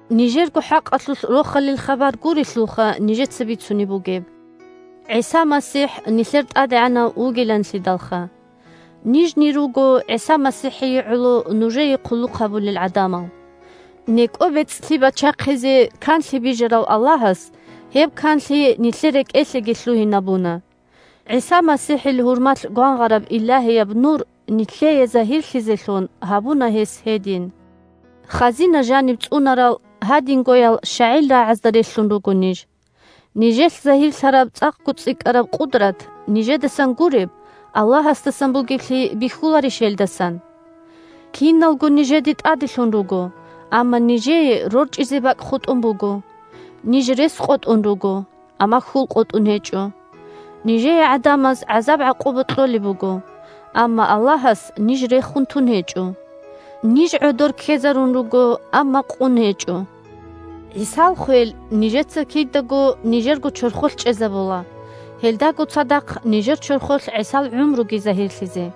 Нижерго хӀакъалъулъ Рохалил хабар гурелъулха нижеца бицунеб бугеб, ГӀиса МасихӀ нилъер ТӀадегӀанав вугиланлъидалха. Нижни руго ГӀиса МасихӀие гӀоло нужее хъулухъ гьабулел гӀадамал. НекӀо бецӀлъи бачахъизе канлъи бижарав Аллагьас гьеб канлъи нилъер рекӀелъеги лъугьинабуна. ГӀиса МасихӀил гьурмалъ гвангъараб Илагьияб Нур нилъее загьирлъизелъун гьабуна гьес гьедин. Хазина жаниб цӀунарал гьадингоял щагӀил рагӀазда релълъун руго ниж. Нижелъ загьирлъараб цӀакъго цӀикӀкӀараб къудрат, нижедасан гуреб, Аллагьасдасан бугеблъи бихьуларищ гьелдасан? Киналго нижеде тӀаделъун руго, амма нижее рорчӀизе бакӀ хутӀун буго. Ниж рес къотӀун руго, амма хьул къотӀун гьечӀо. Нижее гӀадамаз гӀазаб-гӀакъуба кьолеб буго, амма Аллагьас ниж рехун тун гьечӀо. Ниж гӀодор ккезарун руго, амма къун гьечӀо. ГӀисал хвел нижеца кидаго нижерго чорхолъ чӀезабула, гьелдаго цадахъ нижер чорхолъ ГӀисал гӀумруги загьирлъизе.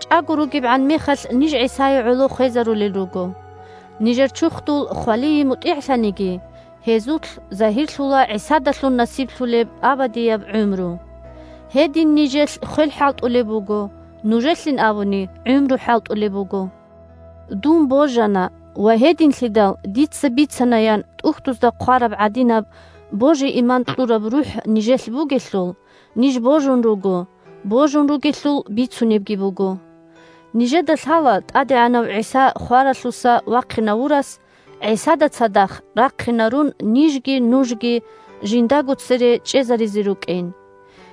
ЧӀаго ругебгӀан мехалъ, ниж ГӀисае гӀоло хвезарулел руго. Нижер чурхдул хвалие мутӀигӀлъаниги, гьезулъ загьирлъула ГӀисадалъун насиблъулеб абадияб гӀумру. Гьедин нижелъ хвел хӀалтӀулеб буго, нужелъин абуни, гӀумру хӀалтӀулеб буго. «Дун божана ва гьединлъидал дица бицана», – ян ТӀухьдузда хъвараб гӀадинаб божи-иман кьураб РухӀ нижелъ бугелъул, ниж божун руго, божун ругелъул бицунебги буго. Нижеда лъала ТӀадегӀанав ГӀиса хваралъуса вахъинавурас, ГӀисада цадахъ рахъинарун, нижги нужги Жиндаго цере чӀезаризе рукӀин.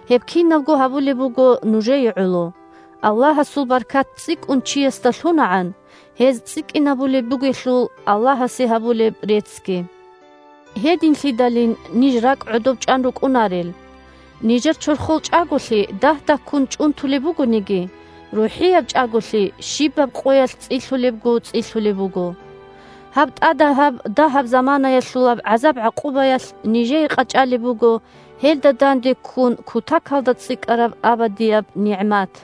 Гьеб кинабго гьабулеб буго нужее гӀоло, Аллагьасул баркат цӀикӀкӀун чиясда лъунагӀан, гьез цӀикӀкӀинабулеб бугелъул Аллагьасе гьабулеб реццги. Гьединлъидалин ниж ракӀ гӀодоб чӀван рукӀунарел. Нижер чорхол чӀаголъи дагь-дагьккун чӀунтулеб бугониги, рухӀияб чӀаголъи щибаб къоялъ цӀилъулебго цӀилъулеб буго. Гьаб тӀадагьаб, дагьаб заманаялъулаб гӀазаб-гӀакъубаялъ нижее къачӀалеб буго гьелда данде ккун кутакалда цӀикӀкӀараб абадияб нигӀмат.